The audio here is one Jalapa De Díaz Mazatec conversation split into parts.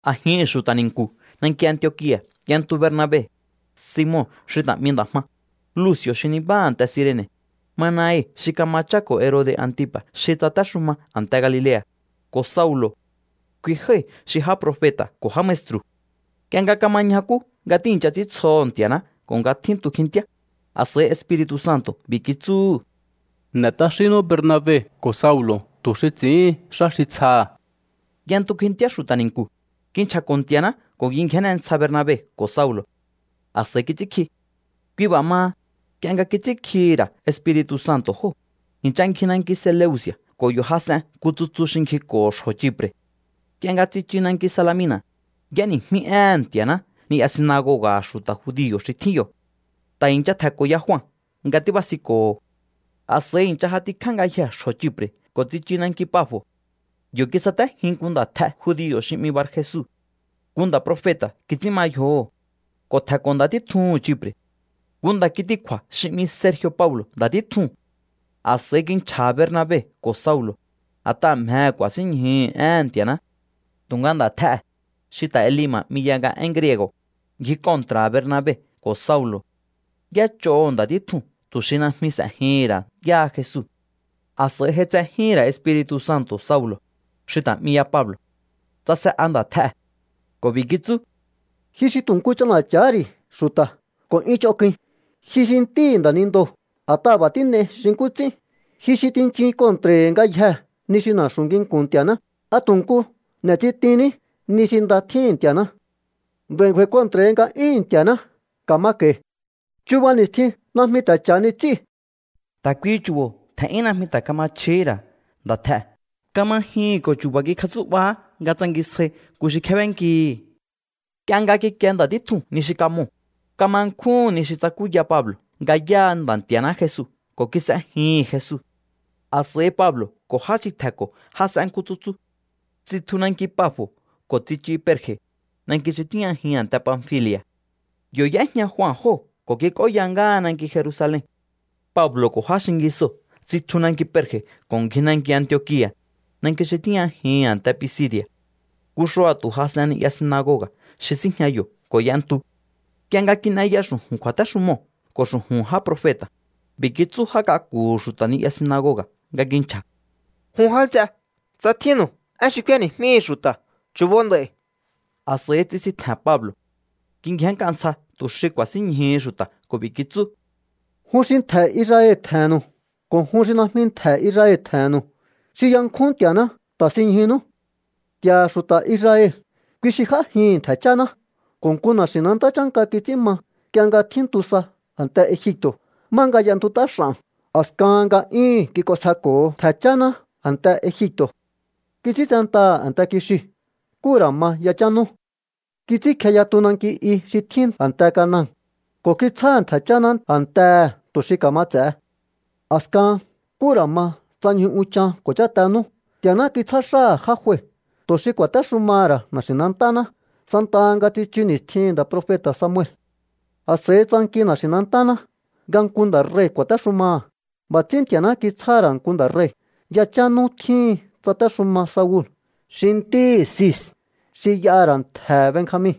A̱jihi̱n xu̱ta̱ ni̱nku̱ nanki Antiokia̱ y'entu Bernabe, Simon xi ta̱ 'mi Nda̱ Jma, Luci̱o̱ xi nibáha a̱nte Cirene̱, Manaen xi kama cháko̱ Herode̱ Antipa̱ xi tsatéxuma a̱nte Galilea̱, ko̱ Saulo̱. Kui jái̱ xi já profeta̱ ko̱ já maestru̱. Nk'ie nga kama ñjakú nga tíi̱ncha ts'íntsjoho̱ Nti̱a̱ná ko̱ nga tjíntu kjintíá, a̱s'a̱i Espiri̱tu̱ Santo̱ b'i̱ kitsúhu̱: —N'e̱ t'axínnú Bernabe ko̱ Saulo̱ tu̱ xi ts'i̱íhin xá xi tsjaha̱. Y'entu kjintíá xu̱ta̱ ni̱nku̱, kinchja̱ko̱ Nti̱a̱ná ko̱ kingjénne ntsja Bernabe ko̱ Saulo̱. A̱s'a̱i kits'ínkji. Kui b'a̱ maha, nk'ie nga kits'ínkjihi̱ ra̱ Espiri̱tu̱ Santo̱ jóo̱, i̱ncha ngji nanki Seleuci̱a̱ ko̱ yo̱ jas'en nku tsutsu xi ngjiko̱ho̱ xjo̱ Chipre̱. Nk'ie nga tsichu nanki Salamina̱, y'éni̱jmí éhe̱n Nti̱a̱ná ni'ya sinagoga̱ha̱ xu̱ta̱ judio̱ xi tjín yo̱. Ta̱ i̱ncha tje̱nko̱ ya Jua nga tíbasinko̱ho̱. A̱s'a̱i i̱ncha j'atikjá ngayjee̱ xjo̱ Chipre̱ ko̱ tsichu nanki Pafo̱. Yo̱ kisatéjin nku nda̱tj'e judio̱ xi 'mi Barjesu. Nku nda̱ profeta̱ kits'ín ma yjoho̱ ko̱ tje̱nko̱ nda̱ títjuhu̱n Chipre̱. Nku nda̱ kitikju̱a̱ xi 'mi Sergi̱o̱ Paulo̱ nda̱ títjuu̱n. A̱s'a̱i kinchja̱ha̱ Bernabe ko̱ Saulo̱, a̱t'aha̱ mjehe̱ ku̱a̱sínñjuhu̱ éhe̱n Nti̱a̱ná. Tu̱nga nda̱tj'ee̱, xi ta̱ Elima̱ 'mi ya nga én griego̱, ngji kontra̱ha̱ Bernabe ko̱ Saulo̱. Y'éch'oho̱ nda̱ títjuu̱n tu̱ xi najmi s'e̱jihi̱n ra̱ yáha Jesu. A̱s'a̱i j'aitsejíhi̱n ra̱ Espiri̱tu̱ Santo̱ Saulo̱, xi ta̱ 'mi ya Pablo̱. Tsase'a nda̱tj'ee̱ ko̱ b'i̱ kitsú: —¡Ji xi tu̱ nku ch'ana̱cha̱há ri̱ xu̱ta̱ ko̱ 'yún ch'onk'uin! ¡Ji xi ntíhi̱ nda̱nindoo̱, a̱t'aha̱ b'a̱ tín'ei xi nkú ts'ín! ¡Ji xi tinchun kontra̱i̱hi̱ ngayjee̱ ni xi na̱xu̱ nginku̱n Nti̱a̱ná! ¿A tu̱ nku n'e̱tsitinní ni xi nda tjíhi̱n Nti̱a̱ná? Nd'a̱i̱ ngju̱a̱i̱ kontra̱hi nga'yúhu̱n Nti̱a̱ná. Ka̱ma ka̱i̱. Chuba ni̱stjin najmi ta̱ cha̱hani ts'íu̱. Ta̱ kuihi chu̱bo̱ tje̱n'yún najmi ta̱ kama chjihí ra̱ nda̱tj'ee̱. Kama jyuhu̱n ko̱ chu̱ba̱ kikjatsú'bahá nga tsangisjai nku xi kjébénkihi̱. Nk'ie nga kikie nda̱ títjuu̱n ni xi kamoo̱, kama nkjúhu̱n ni xi tsakúya Pablo̱ nga yáha Nda̱ Nti̱a̱ná Jesu ko̱ kis'ejihi̱n Jesu. A̱s'a̱i Pablo̱ ko̱ já xi tje̱nko̱ jas'en nku tsutsu. Tsitju nanki Pafo̱ ko̱ tsichu Perge̱, nanki xi tíjñajihi̱n a̱nte Panfili̱a̱. Yo̱ y'éjña Jua jóo̱ ko̱ kik'óya ngáha nanki Jerusalen. Pablo̱ ko̱ já xingisoo̱ tsitju nanki Perge̱ ko̱ ngji nanki Antiokia̱, nanki xi tíjñajihi̱n a̱nte Pisidi̱a̱. Nku xua̱tu̱ jas'en ni'ya sinagoga̱ xi síjña yo̱ ko̱ y'entu. Nk'ie nga kin'eya xu̱ju̱n kju̱a̱téxumoo̱ ko̱ xu̱ju̱n já profeta̱, b'i̱ kitsú já k'aku̱hu̱ xu̱ta̱ ni'ya sinagoga̱ nga kinchja̱: —Jun já nts'e, tsa tjínnu̱u én xi k'úéni̱jmíhu̱u xu̱ta̱, chu̱bo nd'a̱i̱. A̱s'a̱i tsisintje̱n Pablo̱. Kingjénnk'a ntsja tu̱ xi ku̱a̱sínñjuhu xu̱ta̱ ko̱ b'i̱ kitsú: —Jun xi ntje̱ Israel tje̱he̱nnu̱u ko̱ jun xi najmi ntje̱ Israel tje̱he̱nnu̱u xi yankjún Nti̱a̱ná, ta̱sinñjunú. Nti̱a̱ha̱ xu̱ta̱ Israel, kui xi j'ájihi̱n ntje̱ cháná ko̱ nku na̱xi̱nantá chánka kits'ín ma nk'ie nga tjíntu sa a̱nte Egipto̱, má nga y'entut'á x'a̱n. A̱skahan nga'yúhu̱n kik'onsjeko̱ho ntje̱ cháná a̱nte Egipto̱. Kits'íntsentaha̱ a̱nte kixiu̱ nkú ra̱ ma yachán nú. Kits'ínkje yatu nanki i xi tjín a̱nte Canaan ko̱ kitsjáha̱ ntje̱ cháná a̱ntehe̱ tu̱ xi ka̱ma ts'e̱he. ’A̱skahan, nkú ra̱ ma tsa ñju unchan ko̱ cháte nú, Nti̱a̱ná kitsjá xáha̱ já jue tu̱ xi ku̱a̱téxumaha̱ ra̱ na̱xi̱nantáná santaha nga tsichu ni̱stjihi̱n nda̱ profeta̱ Samuel. A̱s'a̱i tsanki na̱xi̱nantáná nga nku nda̱ rei̱ ku̱a̱téxumaha̱. B'a̱ ts'ín Nti̱a̱ná kitsjáha̱ ra̱ nku nda̱ rei̱. Yachán nú tjíhin tsatéxuma Saul xi ntíhi̱ Cis xi y'aha̱ ra̱ ntje̱he̱ Benjamin.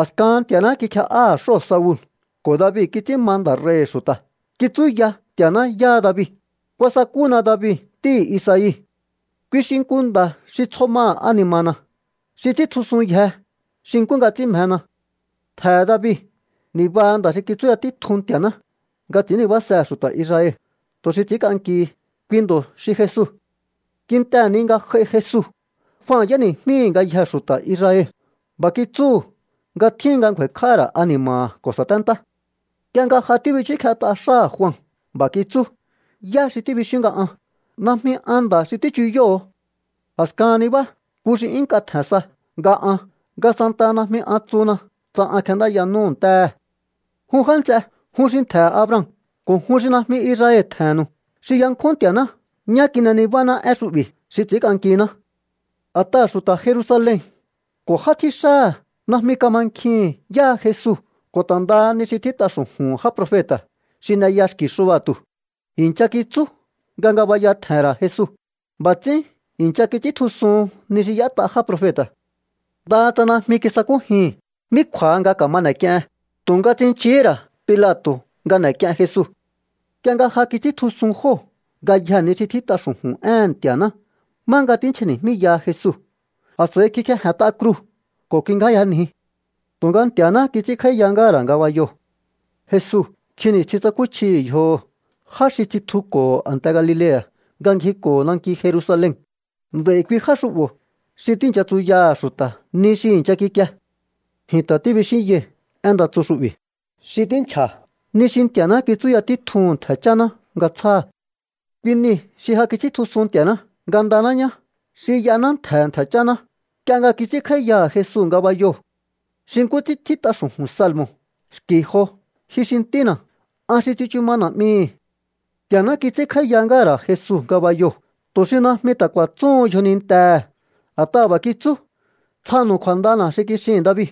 ’A̱skahan Nti̱a̱ná kikje'áha̱ xóo̱ Saul ko̱ David kits'ín ma nda̱ rei̱hi̱ xu̱ta̱. Kitsúya Nti̱a̱ná yáha David: “Kuasakúna David ntíhi̱ Isai. Kui xi nku nda̱ xi tsjo maha̱ ani̱ma̱na̱, xi ts'i̱íntjusunyje xi nkú nga ts'ín mjena.” Ntje̱he̱ David nibaha nda̱ xi kitsúya títjun Nti̱a̱ná nga ts'i̱ín nibásehe̱ xu̱ta̱ Israel tu̱ xi ts'i̱ínk'ankihi. Kui ndo̱ xi Jesu. ’Kintehe̱ ni nga j'ai Jesu, Jua y'éni̱jmíhi̱ ngayjee̱ xu̱ta̱ Israel. B'a̱ kitsúhu̱ nga tjíhin nga ngju̱a̱i̱kj'áha̱ ra̱ ani̱ma̱ha̱ ko̱ sa̱téntá. Nk'ie nga ja tíbichúkjet'a xáha̱ Jua, b'a̱ kitsú: “¿Yá xi tíbixíún nga an? Najmi an nda̱ xi tíchuyóho̱o. A̱skahan nibá nku xi 'yún nk'a tje̱n sa nga an, nga santaha najmi an tsuhuna tsa an kjendáya n'úhu̱ ntéhe̱.” ’Jun já nts'e, jun xi ntje̱he̱ Abraham ko̱ jun xi najmi Israel tje̱he̱nnu̱u xi yankjún Nti̱a̱ná, ñá kin'e nibáná én xu'bi̱ xi ts'i̱ínk'ankiná. A̱t'aha̱ xu̱ta̱ Jerusalen ko̱ já tjíxáha̱ najmi kamankjihi̱n yáha Jesu ko̱ ta̱ ndaha ni xi tjít'a xu̱ju̱hu̱n já profeta̱ xi n'eya xki̱ xua̱tu̱. I̱ncha kitsú nga ngabaya tje̱he̱n ra̱ Jesu. B'a̱ ts'ín i̱ncha kits'íntjusuhun ni xi y'ét'a já profeta̱. Ndaha tsa najmi kisakújihi̱n mí kju̱a̱ha nga ka̱ma n'e̱k'iehen, tu̱nga tsinchihí ra̱ Pilato̱ nga n'e̱k'ien Jesu. ’Nk'ie nga ja kits'íntjusun jóo̱ ngayjee̱ ni xi tjít'a xu̱ju̱n éhe̱n Nti̱a̱ná má nga tínchja̱ni̱jmíyaha Jesu, a̱s'a̱i kikjeje̱nt'a kruu̱ ko̱ kingjáyanji. Tu̱nga Nti̱a̱náhá kits'ínkj'áíya ngáha̱ ra̱ ngabayoo̱. Jesu nkjin ni̱stjin tsakúchjihi̱ yjoho̱ já xi tsitjuko̱ho̱ a̱nte Galilea̱ nga ngjiko̱ho̱ nanki Jerusalen. Nd'a̱i̱ kui já xu'bo̱ xi tíi̱ncha tsuyaha̱ xu̱ta̱ ni xi i̱ncha kikie. ’Ji̱n ta̱ tíbixínyai̱ én nda tsu xu'bi̱ xi tínchja̱ ni xi Nti̱a̱ná kitsúya títjuhu̱n ntje̱ cháná nga tsjáha̱. Kui niu̱ xi ja kits'íntjusun Nti̱a̱ná ngandaná ñá xi y'ahaná ntje̱he̱ ntje̱ cháná, nk'ie nga kits'ínkj'áíyaha̱ Jesu ngabayoo̱. Xi nkú ts'ín tjít'a xu̱ju̱n salmo̱ xki̱ jo: “Ji xi Ntína̱, an xi tsichu ma Na̱'mihi̱.” Nti̱a̱ná kits'ínkj'áíya ngáha̱ ra̱ Jesu ngabayoo̱ tu̱ xi najmi ta̱ ku̱a̱tsúhun yjonintehe̱. A̱t'aha̱ b'a̱ kitsú: “Tsjanu̱u kju̱a̱ndana̱ xi kixihi̱n David.”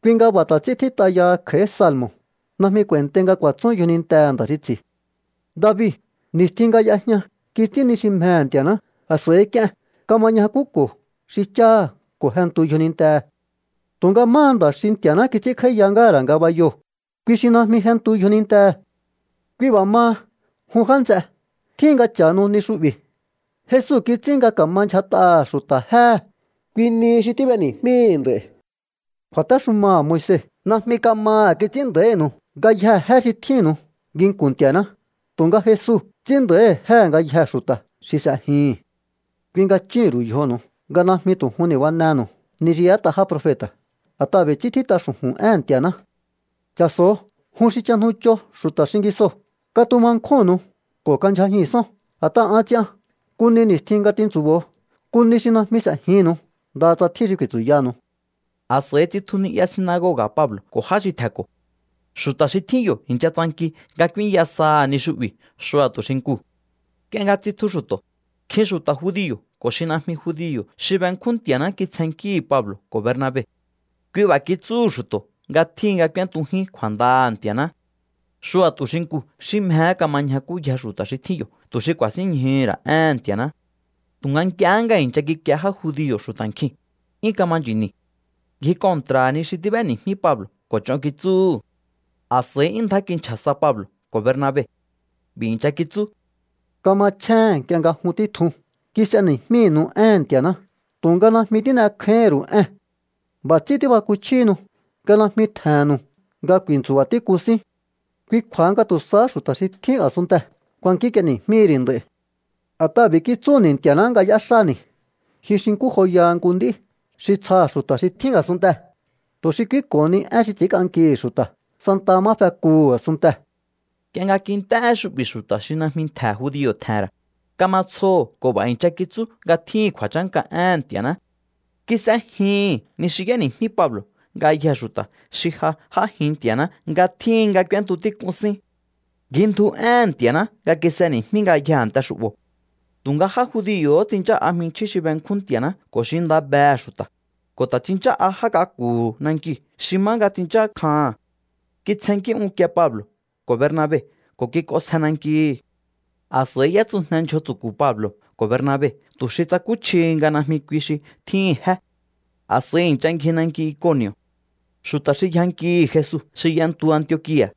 ’Kui nga b'a̱ ta̱ ts'ín tjít'a yaha kj'a̱í salmo̱: “Najmi k'u̱a̱i̱ntei nga ku̱a̱tsún yjonintehe̱ nda̱ xi ts'i̱.” David, ni̱stjin nga y'ejña kits'ín ni xi mjehe̱ Nti̱a̱ná, a̱s'a̱i k'ien. Kama ñjakúko̱ xi cháha̱ ko̱ jentu yjonintehe̱. Tu̱nga máha nda̱ xi Nti̱a̱ná kits'ínkj'áíya ngáha̱ ra̱ ngabayoo̱, kui xi najmi jentu yjonintehe̱. ’Kui b'a̱ maha, jun já nts'e, tjíhin nga cha̱hanu ni xu'bi̱. Jesu kits'ín nga ka̱ma ndyjat'aha̱ xu̱ta̱ jéhe̱. Kui nihi xi tíb'eni̱jmíi̱ nd'a̱i̱. Kju̱a̱téxumaha̱ Moise najmi kamaha̱ kits'ín nda̱ínu̱u ngayjee̱ jé xi tjínnu̱u nginku̱n Nti̱a̱ná, tu̱nga Jesu ts'ín nda̱íhi̱ jéhe̱ ngayjee̱ xu̱ta̱ xi s'ejihi̱n. ’Kui nga chúhu̱n ru̱u yjonu̱u nga najmi tu̱ jun ni̱banenu̱u ni xi y'ét'a já profeta̱. A̱t'aha̱ b'i̱ ts'ín tjít'a xu̱ju̱n éhe̱n Nti̱a̱ná: Cha̱so̱o, jun xi chajnucho xu̱ta̱ xingisoo̱, katuma nkjúnnu̱u ko̱ kandyjajihi̱nsón. A̱t'aha̱ an ts'ian nku ni ni̱stjin nga tintsu̱bo̱o, nku ni xi najmi s'e̱jinnu̱u ndaha tsa tjín xi ku̱i̱tsu̱yanu̱u. A̱s'a̱i tsitju ni'ya sinagoga̱ Pablo̱ ko̱ já xi tje̱nko̱. Xu̱ta̱ xi tjín yo̱ i̱ncha tsanki nga k'úínya saha̱ ni xu'bi̱ xua̱tu̱ xinkuu̱. Nk'ie nga tsitju xu̱to̱, nkjin xu̱ta̱ judio̱ ko̱ xi najmi judio̱ xi benkjún Nti̱a̱ná kitsjennkíhi̱ Pablo̱ ko̱ Bernabe. Kui b'a̱ kitsúhu̱ xu̱to̱ nga tjíhin nga k'úéntujín kju̱a̱ndaha̱ Nti̱a̱ná. Xua̱tu̱ xinkuu̱ xi mjehé kama ñjakúyjee̱ xu̱ta̱ xi tjín yo̱ tu̱ xi ku̱a̱sínñjuhu̱ ra̱ éhe̱n Nti̱a̱ná. Tu̱nga nk'ie nga i̱ncha kikie já judio̱ xu̱ta̱ nkjiu̱n, 'yún kama nchi̱ni̱. Ngji kontra̱ha̱ ni xi tíb'éni̱jmí Pablo̱ ko̱ ch'on kitsúhu̱. A̱s'a̱i 'yún ndjá kinchja̱ sa Pablo̱ ko̱ Bernabe. B'i̱ i̱ncha kitsú: —Kamachjéhe̱n nk'ie nga jun títjun kis'eni̱jmínu̱u éhe̱n Nti̱a̱ná, tu̱nga najmi tín'ekjáíhín ru̱u ée̱n. B'a̱ ts'ín tíbakuchjíhinu nga najmi tje̱he̱nnu̱u nga ku̱i̱ntsu̱ba̱ tík'un síún. Kui kju̱a̱ha nga tu̱ sahá xu̱ta̱ xi tjín a̱sunntee̱ kuankínk'ieni̱jmíhi̱ ri̱ nd'a̱i̱. A̱t'aha̱ b'i̱ kitsúni̱ Nti̱a̱ná nga y'éxáni̱: Ji xi nkú joyaha nku nd'í xi tsjaha̱ xu̱ta̱ xi tjín a̱sunntee̱, tu̱ xi k'úínko̱honi én xi ts'ínk'ankihi̱ xu̱ta̱ santaha má fekuhu̱ a̱sunntee̱. Nk'ie nga kint'é én xu'bi̱ xu̱ta̱ xi najmi ntje̱ judio̱ tje̱he̱n ra̱, kama tsjoho̱ ko̱ b'a̱ i̱ncha kitsú nga tjíhi̱n kju̱a̱chánka éhe̱n Nti̱a̱ná. Kis'ejihi̱n ni xi y'éni̱jmí Pablo̱ ngayjee̱ xu̱ta̱ xi ja j'ájin Nti̱a̱ná nga tjíhin nga k'úéntu tík'un sín. Ngjindju éhe̱n Nti̱a̱ná nga kis'eni̱jmí ngayjee̱ a̱nte xu'bo̱. Tu̱nga já judio̱hó tsinchá'a jminchjín xi benkjún Nti̱a̱ná ko̱ xi nda behe̱ xu̱ta̱, ko̱ ta̱ tsinchá'a já k'aku̱hu̱ nankiu̱ xi má nga tsinchákjaha̱n. Kitsjennkí unkie Pablo̱ ko̱ Bernabe ko̱ kik'onsje nankihi̱. A̱s'a̱i y'étsujne ndyjo tsu̱ku̱ Pablo̱ ko̱ Bernabe tu̱ xi tsakúchjihi nga najmi kui xi tjíhi̱n jé. A̱s'a̱i i̱ncha ngji nanki Iconi̱o̱. Xu̱ta̱ xi yjankihi̱ Jesu xi y'entu Antiokia̱,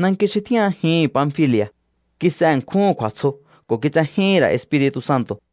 nanki xi tíjñajihi̱n Panfili̱a̱, kis'e ṉkjúhu̱n kju̱a̱tsjo ko̱ kitsejíhi̱n ra̱ Espiri̱tu̱ Santo̱.